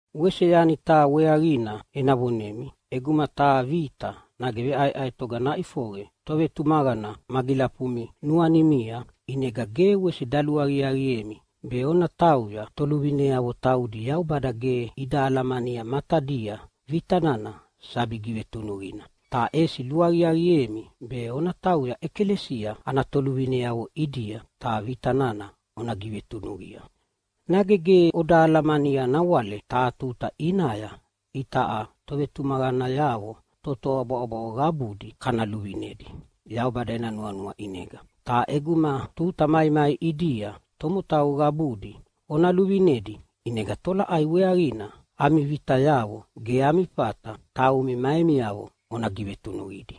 Wese yani taha weaqina ena vonemi. ʼEguma taha vita nage veʼaeʼaetoga naʼifoqe tovetumaqana magilafumi nuanimia, ʼinega ge wese daluaqiaqiemi be ona tauya toluvineavo taudi Yaubada ge ida alamania matadia vita nana sabi givetunuqina, ta ʼesi luaqiaqiemi be ona tauya ʼekalesia ana toluvineavo ʼidia ta vita nana ona givetunuqia. Nage ge oda alamania nawale taha tuta ʼinaya itaʼa tovetumaqanayavo totoa bwaʼobwaʼo qabudi kana luvinedi Yaubada ena nuanua ʼinega. Ta ʼeguma tuta maimai ʼidia tomotau qabudi ona luvinedi, ʼinega tolaʼai weaqina ami vitayavo ge ami fata taumi ma emiavo ona givetunuqidi?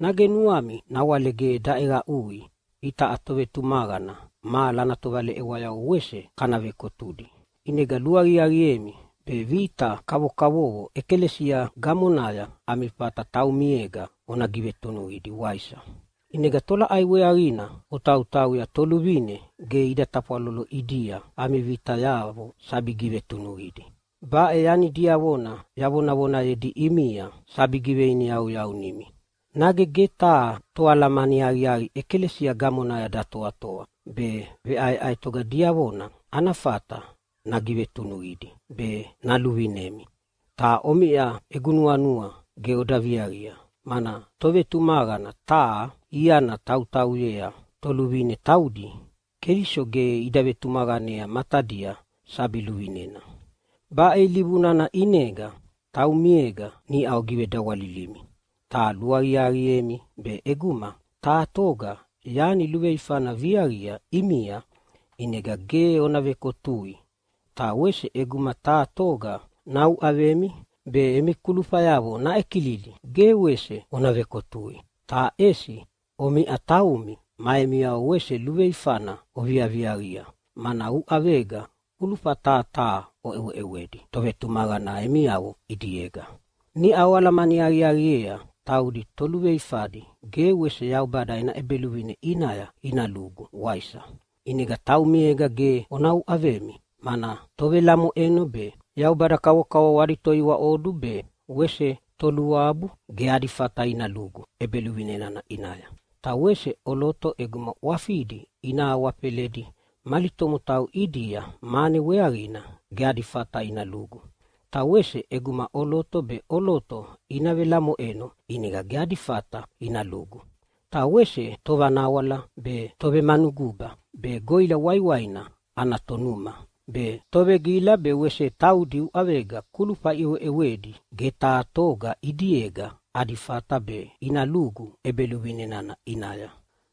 Nage nuami nawale ge daʼeqaʼui itaʼa tovetumaqana mahala ana tovaleʼewayavo wese kana vekotudi. ʼInega luaqiaqiemi be vita kavokavovo ʼekalesia gamonaya ami fata taumiega ona givetunuqidi, waisa? ʼInega tolaʼai weaqina otautauya toluvine ge ida tafwalolo ʼidia ami vitayavo sabi givetunuqidi? Baʼe yani diavona yavonayedi ʼimia sabi giveiniyauyaunimi. Nage ge taha toalamani aqiaqi ʼekalesia gamonaya datoatoa be veʼaeʼaetoga diavona ana fata nagivetunuqidi be naluvinemi? Ta omiʼa egu nuanua ge oda viaqia, mana tovetumaqana taha iana tautauyea toluvine taudi Keliso ge ida vetumaqanea matadia sabi luvinena. Baʼe ilivu nana ʼinega taumiega niʼa ogivedawalilimi. Ta luaqiaqiemi be ʼeguma taha toga yani luveifana naviaqia ʼimia, ʼinega ge ona vekotui. Ta wese ʼeguma taha toga nauʼavemi be emi kulufayavo naʼekilidi ge wese ona vekotui. Ta ʼesi omiʼa taumi ma emiavo wese luveifana oviaviaqia, mana uʼavega kulufa taha taha oʼeweʼewedi tovetumaqana emiavo ʼidiega. Niʼa oalamani aqiaqiea taudi toluveifadi ge wese Yaubada ena ʼEbeluvine ʼinaya ina lugu, waisa? ʼInega taumiega ge ona uʼavemi, mana tovelamoʼeno be, yaubada kavokavovo adi toiwaʼodu be wese toluabu ge adi fata ina lugu ʼEbeluvine nana ʼinaya. Ta wese ʼoloto ʼeguma ʼwafidi ina awafeledi mali tomotau ʼidia mane weaqina ge adi fata ina lugu. Ta wese ʼeguma ʼoloto be ʼoloto ina velamoʼeno ʼinega ge adi fata ina lugu. Ta wese tovanawala be, tovemanuguba be, goʼila waiwaina ana tonuma be, tovegila be wese taudi uʼavega kulufa iʼeweʼewedi ge taha toga ʼidiega adi fata be ina lugu ʼEbeluvine nana ʼinaya.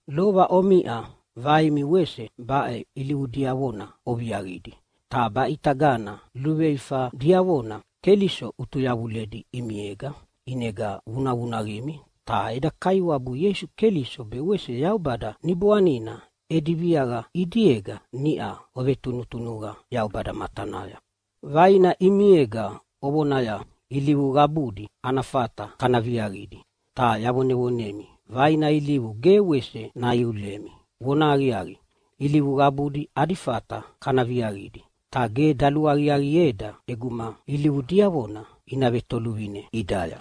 Lova omiʼa vaimi wese baʼe ilivu diavona oviaqidi, ta baʼitagana luveifa diavona Keliso ʼutuyavuledi ʼimiega ʼinega vunavunaqimi. Ta eda Kaiwabu Ieisu Keliso be wese Yaubada Niboanina edi viaqa ʼidiega niʼa ovetunutunuqa Yaubada matanaya. Vaina ʼimiega ovonaya, “Ilivu qabudi ana fata kana viaqidi.” Ta yavonevonemi, vaina ilivu ge wese naiulemi. Vonahaqiaqi, ilivu qabuna ada fata kana viaqidi, ta ge daluaqiaqieda ʼeguma ilivu diavona ina vetoluvine ʼidaya.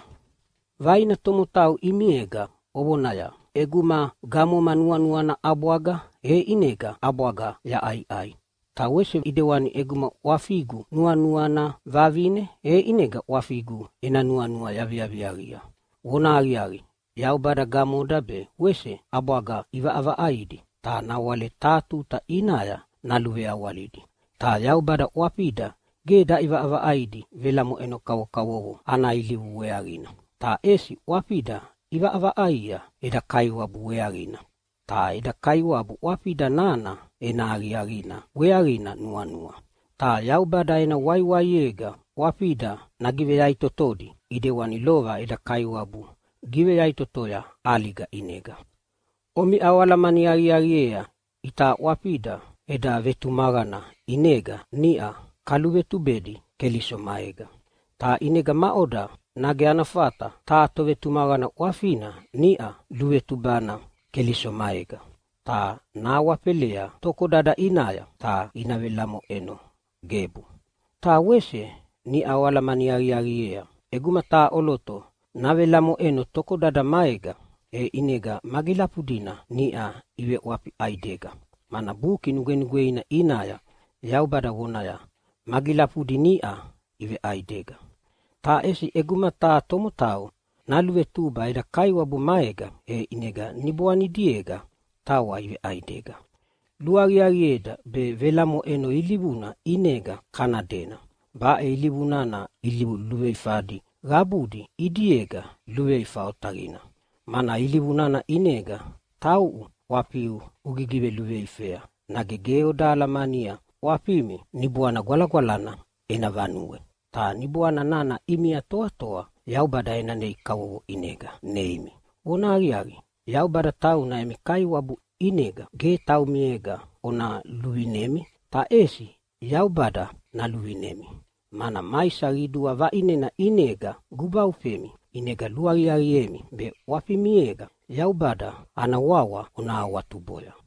Vaina tomotau ʼimiega ovonaya, “ʼEguma gamogu nuanuana ʼabwaga, e ʼinega ʼabwaga yaʼaiʼai, ta wese ʼidewani ʼeguma ʼwafigu nuanuana vavine, e ʼinega ʼwafigu ena nuanua yaviaviaqia.” Vonahaqiaqi, Yaubada gamoda be wese ʼabwaga ʼivaʼavaʼaidi, ta nawale taha tuta ʼinaya naluveawalidi. Ta Yaubada ʼwafida ge daʼivaʼavaʼaidi velamoʼeno kavokavovo ana ilivu weaqina, ta ʼesi ʼwafida ʼivaʼavaʼaia eda Kaiwabu weaqina, ta eda Kaiwabu ʼwafida nana ena aqiaqina weaqina nuanua. Ta Yaubada ena waiwaiega ʼwafida nagiveyaʼitotodi ʼidewani lova eda Kaiwabu giveyaʼitotoya ʼaliga ʼinega. Omiʼa oalamani aqiaqiea itaʼa ʼwafida eda vetumaqana ʼinega niʼa kaluvetubedi Keliso maega. Ta ʼinega maʼoda, nage ana fata taha tovetumaqana ʼwafina niʼa luluvetubana Keliso maega ta nahawafelea tokodada ʼinaya ta ina velamoʼeno? Gebu! Ta wese niʼa oalamani aqiaqiea ʼeguma taha ʼoloto navelamoʼeno tokodada maega, e ʼinega magilafudina niʼa iveʼwafi ʼaidega. Mana Buki Nugwenugweina ʼinaya Yaubada vonaya, “Magilafudi niʼa iveʼaidega.” Ta ʼesi ʼeguma taha tomotau naluvetuba eda Kaiwabu maega, e ʼinega niboanidiega tawa iveʼaidega. Luaqiaqieda be velamoʼeno ilivuna ʼinega kana dena! Baʼe ilivu nana ilivu luveifadi qabudi ʼidiega luveifa otaqina, mana ilivu nana ʼinega tauʼu ʼwafiu ugigiveluveifea. Nage ge oda alamania ʼwafimi Niboana Gwalagwalana ena vanue? Ta Niboana nana ʼimia toatoa Yaubada ena nei kavovo ʼinega neimi. Vonahaqiaqi, Yaubada tauna emi Kaiwabu, ʼinega ge taumiega ona luvinemi, ta ʼesi Yaubada naluvinemi, mana maisa qidua vaʼinena ʼinega gubaufemi. ʼInega luaqiaqiemi be ʼwafimiega Yaubada ana wawa ona awatuboya.